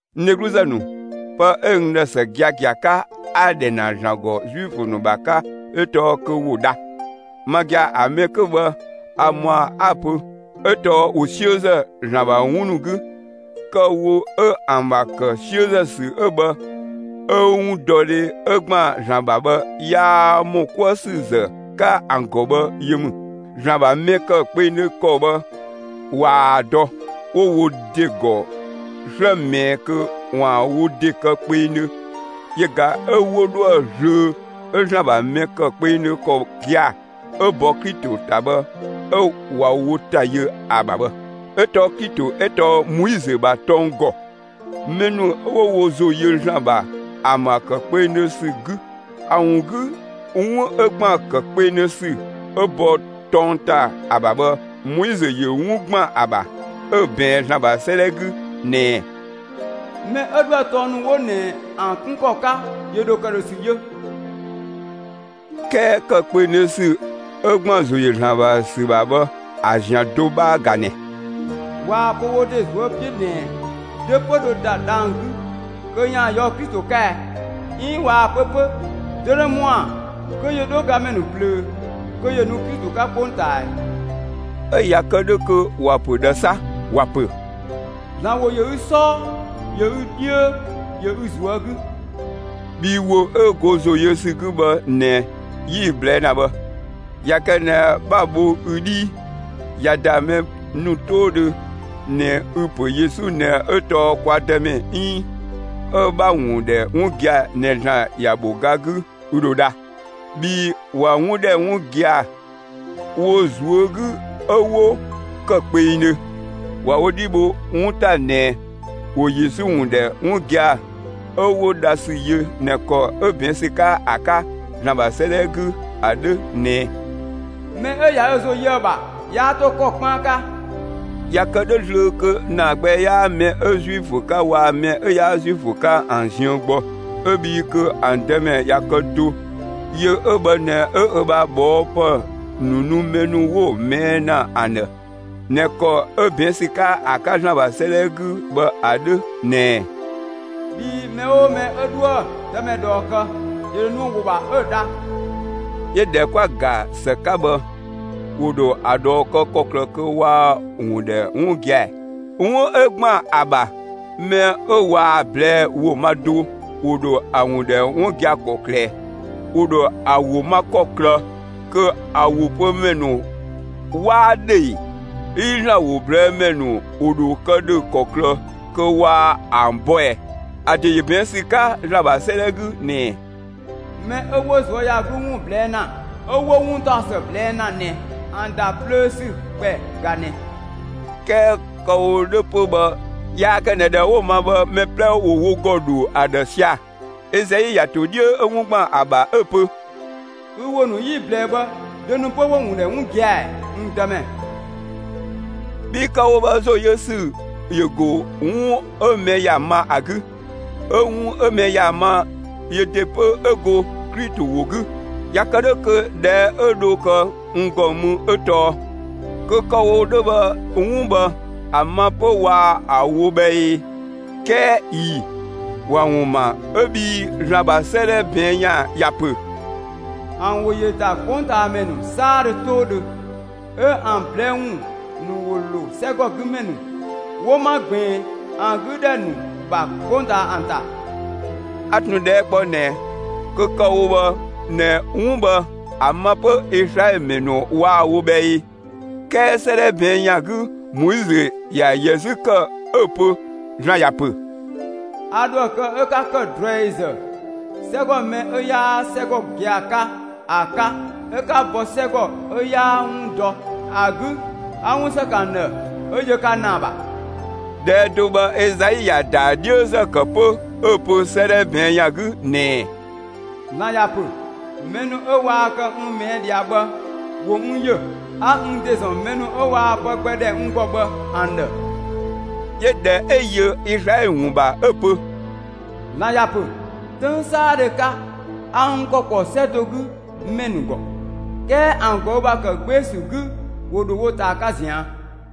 N dhegluzë ‑nu, pë 'ö n ‑dhë ‑së giagia, 'a‑ ‑dhɛ ‑na ‑Zlan ‑gɔ Zuifö ‑nu ‑bha 'ka 'ö tɔɔ kö ‑wo dha. Ma gia‑, ‑a mɛ 'kö bhë a ‑mɔa 'a‑ pö; 'ö tɔɔ ‑wo 'siözë ‑Zlan ‑bha 'wun ‑nu 'gü. Kë‑ wo 'ö ‑an ‑bha ‑kë 'siözë ‑sü 'ö bhë 'ö 'wundɔdhe 'ö ‑gban ‑Zlan ‑bha bhë, 'yaa ‑mɔ 'kuë ‑sü ‑zë 'ka ‑an ‑gɔ bhë yö ‑mü. ‑Zlan ‑bha mɛ ‑kë kpengdhö ‑kɔ bhë waa‑ dɔ; 'wo wo ‑de ‑gɔ 'slë ꞊mɛɛ kö ‑waan wo ‑de kë kpengdhö yö ꞊ga 'ö 'wo dhoë zlöö 'ö ‑Zlan ‑bha mɛ ‑kë kpengdhö ‑kɔ gia‑ ('ö bɔ Klito ‑ta) bhë 'ö ꞊wa wo ‑ta yö ‑a ‑bha bhë. 'Ö tɔɔ Klito 'ö tɔɔ Moizö ‑bha tɔng ‑gɔ, mɛ ‑nu 'ö 'wo wo ‑zo yö ‑Zlan ‑bha ‑an ‑bha ‑kë kpengdhö ‑sü 'gü. ‑A ‑wun 'gü, 'wun 'ö ‑gban ‑kë kpengdhö ‑sü 'ö bɔ tɔng ‑ta ‑a ‑bha bhë, Moizö ‑yö 'wun ‑gban ‑a ‑bha 'ö‑ ꞊bɛɛn ‑Zlan ‑bha 'sëëdhɛ 'gü ꞊nɛ: Mɛ 'ö 'dhoë‑ tɔng ‑nu 'wo ꞊nɛ ‑an kun ‑an 'kun ‑kɔ 'ka, ‑yö ‑dho ‑këdhösü yö. 'Kɛɛ ‑kë kpengdhö ‑sü 'ö ‑gban ‑zo ‑yö ‑Zlan ‑bha ‑sü ‑bha bhë ‑a ‑zian do 'bhaa ꞊ga ꞊nɛ: 'Waa‑ pö wo ‑de ꞊zuö' 'piö ꞊nɛ: Dö 'pö dho ‑da dhang‑ 'gü kö ‑yaan ꞊yɔɔ' Klito 'ka ɛ? 'Iin 'waa‑ pö 'pö: Dö ‑dho ‑mɔa kö ‑yö 'dho gamɛ ‑nu ꞊plöö kö ‑yö nu Klito 'ka 'kpongtaa ꞊ɛɛ? 'Ö ꞊ya kë 'dhö kö ‑wa ‑pö ꞊dhë 'sa? ‑Wa ‑pö: ‑Zlan ‑wo ‑yö ü 'sɔɔ, ‑yö ü dhiö, ‑yö ü ꞊zuö' 'gü, bhii ‑wo 'ö go ‑zo yö ‑sü 'gü bhë ꞊nɛ 'yi‑ ꞊blɛɛ' ‑na bhë. ꞊Ya kë ꞊nɛ 'bha‑ bho ü 'dhii, ꞊ya ‑da mɛ ‑nu 'toodhö ꞊nɛ 'ü‑ pö Yesu ꞊nɛ 'ö tɔɔ kwa Dëmɛ 'iin 'ö 'bha‑ ‑wun ‑dhɛ 'wun gia‑ ꞊nɛ ‑Zlan ‑ya ‑bho ga 'gü, ü ‑dho dha. Bhii ꞊wa 'wun ‑dhɛ 'wun gia‑ wo ꞊zuö' 'gü 'ö 'wo ‑kë kpengdhö; ꞊wa wo 'dhi bho 'wun ‑ta ꞊nɛ ‑wo Yesu ‑wun ‑dhɛ 'wun gia‑ 'ö 'wo dha ‑sü yö ꞊nɛ ‑kɔ 'ö ꞊bɛɛn' ‑sü 'ka ‑a 'ka ‑Zlan ‑bha 'sëëdhɛ 'gü ‑a 'dhö ꞊nɛ: Mɛ 'ö ꞊ya ö ‑zo yö ‑a ‑bha, 'yaa 'to ‑kɔ 'kpaan 'ka. ꞊Ya kë 'dhö zlöö, kö ‑naa gbɛ 'yaa mɛ 'ö Zuifö 'ka waa‑ mɛ 'ö 'yaa Zuifö 'ka ‑an ziën gbɔ; 'ö bhii kö ‑an Dëmɛ ꞊ya kë do; yö 'ö bhë ꞊nɛ 'ö ö ‑bha ꞊bhɔɔpë ‑nu nu mɛ ‑nu 'wo‑ ꞊mɛɛ' ‑na ‑an ‑dhë, ꞊nɛ ‑kɔ 'ö ꞊bɛɛn' ‑sü 'ka ‑a 'ka ‑Zlan ‑bha 'sëëdhɛ 'gü bhë ‑a 'dhö ꞊nɛ: Bhii mɛ 'oo mɛ 'ö 'dhoë‑ Dëmɛ ꞊dhɔɔ kë, (‑yö ‑dho nu ‑a ‑wo ‑bha,) 'ö‑ dha. 'Yö ꞊dhɛ 'kwa‑ ‑ga ‑së 'ka bhë, ‑wo ‑dho ‑a ꞊dhɔɔ kë ‑kɔklë kö waa‑ ‑wun ‑dhɛ 'wun gia‑ ‑ɛ? 'Wun 'ö ‑gban ‑a ‑bha, mɛ 'ö waa‑ ꞊blɛɛ' ‑wo ma do, ‑wo ‑dho ‑a ‑wun ‑dhɛ 'wun gia‑ ‑kɔklë ꞊ɛ? ‑Wo ‑dho ‑a ‑wo ma ‑kɔklë kö ‑a ‑wo pö ‑mɛ ‑nu 'waa 'dhö ee? 'Iin ‑Zlan ‑wo ꞊blɛɛ' ‑mɛ ‑nu ‑wo ‑dho kë ‑dhö ‑kɔklë kö waa ‑an bɔ ꞊ɛɛ? ‑A ‑de ‑yö ꞊bɛɛn' ‑sü 'ka ‑Zlan ‑bha 'sëëdhɛ 'gü ꞊nɛ: Mɛ 'ö 'wo ꞊zuöyagluu ‑wun ꞊blɛɛ' ‑na 'ö 'wo 'wuntaɔsë ꞊blɛɛ' ‑na ꞊nɛ, ‑an ‑da plöö ‑sü ‑kpɛ ꞊ga ꞊nɛ! 'Kɛɛ kë‑ wo 'dhö 'pö bhë yaa kë ꞊nɛ ‑dhɛ 'wo‑ ma bhë, mɛ 'plɛ ‑wo wo ‑gɔ ‑dho ‑a ‑dhë sia‑. Ezai ‑ya ‑to 'dhiö 'ö 'wun ‑gban ‑a ‑bha 'ö‑ pö: Ü ‑wo ‑nu 'yi‑ ꞊blɛɛ bhë, dö ‑nu 'pö 'wo‑ ‑wun ‑dhɛ 'wun gia‑ ‑ɛɛ, n Dëmɛ? Bhii kë‑ wo bhë ‑zo yö ‑sü ‑yö ‑go 'wun 'ö mɛ ‑ya ma ‑a 'gü, 'ö 'wun 'ö mɛ ‑ya ma yö ‑de 'pö 'ö go Klito ‑wo 'gü. ꞊Ya kë 'dhö kö ꞊dhɛɛ' 'ö dho kë n ‑gɔ mü 'ö tɔɔ: Kö kë‑ wo 'dhö bhë, 'wun bhë ‑a ma 'pö waa‑ wo bhë ee? 'Kɛɛ ꞊ii‑; ‑wa ‑wun ‑ma 'ö bhii ‑Zlan ‑bha 'sëëdhɛ ꞊bɛɛn' ‑yan ‑ya ‑pö: ‑An ‑wo ‑yö ‑da 'kpongtaamɛ ‑nu 'saadhö 'toodhö, 'ö ‑an ꞊blɛɛ' ‑wun ‑nu ‑wo ‑lo 'sɛgɔgüdhɛ ‑nu 'wo 'ma ꞊gbiin ‑an 'gü ‑dhɛ ‑nu ‑bha, 'kpongtaa ‑an ‑ta. A ꞊tun ꞊dhɛɛ' kpɔ ꞊nɛ: Kö kë‑ wo bhë ꞊nɛ 'wun bhë ‑a ma 'pö Izlaɛlö ‑mɛ ‑nu waa‑ wo bhë ee? 'Kɛɛ 'sëëdhɛ ꞊bɛɛn' ‑yan 'gü Moizö ‑ya ‑yɛ 'zü ‑kë 'ö‑ pö ‑Zlan ‑ya ‑pö: A ‑dhoë kë 'ö 'ka ‑kë ꞊druɛizë 'sɛgɔ mɛ 'ö 'yaa 'sɛgɔ gia‑ 'ka ‑a 'ka 'ö 'a bɔ 'sɛgɔ 'ö 'yaa 'wun dɔ ‑a 'gü 'a 'wun ‑së ‑kë ‑an ‑dhë 'ö yö ka ‑naa ‑bha. ꞊Dhɛɛ' do 'ö bhë Ezai ‑ya ‑daa 'dhiözë ‑kë 'pö 'ö‑ pö 'sëëdhɛ ꞊bɛɛn' ‑yan 'gü ꞊nɛ: ‑Zlan ‑ya ‑pö: Mɛ ‑nu 'ö waa kë n ꞊mɛɛ' ꞊dhia bhë, ‑wo n ‑yö; 'ö 'a n ‑de ‑zɔn mɛ ‑nu 'ö waa pë gbɛ ‑dhɛ n ‑gɔ bhë ‑an ‑dhë. 'Yö ꞊dhɛ 'ö yö Izlaɛlö ‑wun ‑bha 'ö‑ pö: ‑Zlan ‑ya ‑pö: 'Töng 'saadhö 'ka, a n ‑kɔ ‑po 'sɛ do 'gü ‑mɛ ‑nu ‑gɔ; 'kɛɛ ‑an ꞊gɔü' ‑bha ‑kë 'gbee‑ ‑sü 'gü, ‑wo ‑dho wo ꞊taa 'ka ꞊zian'.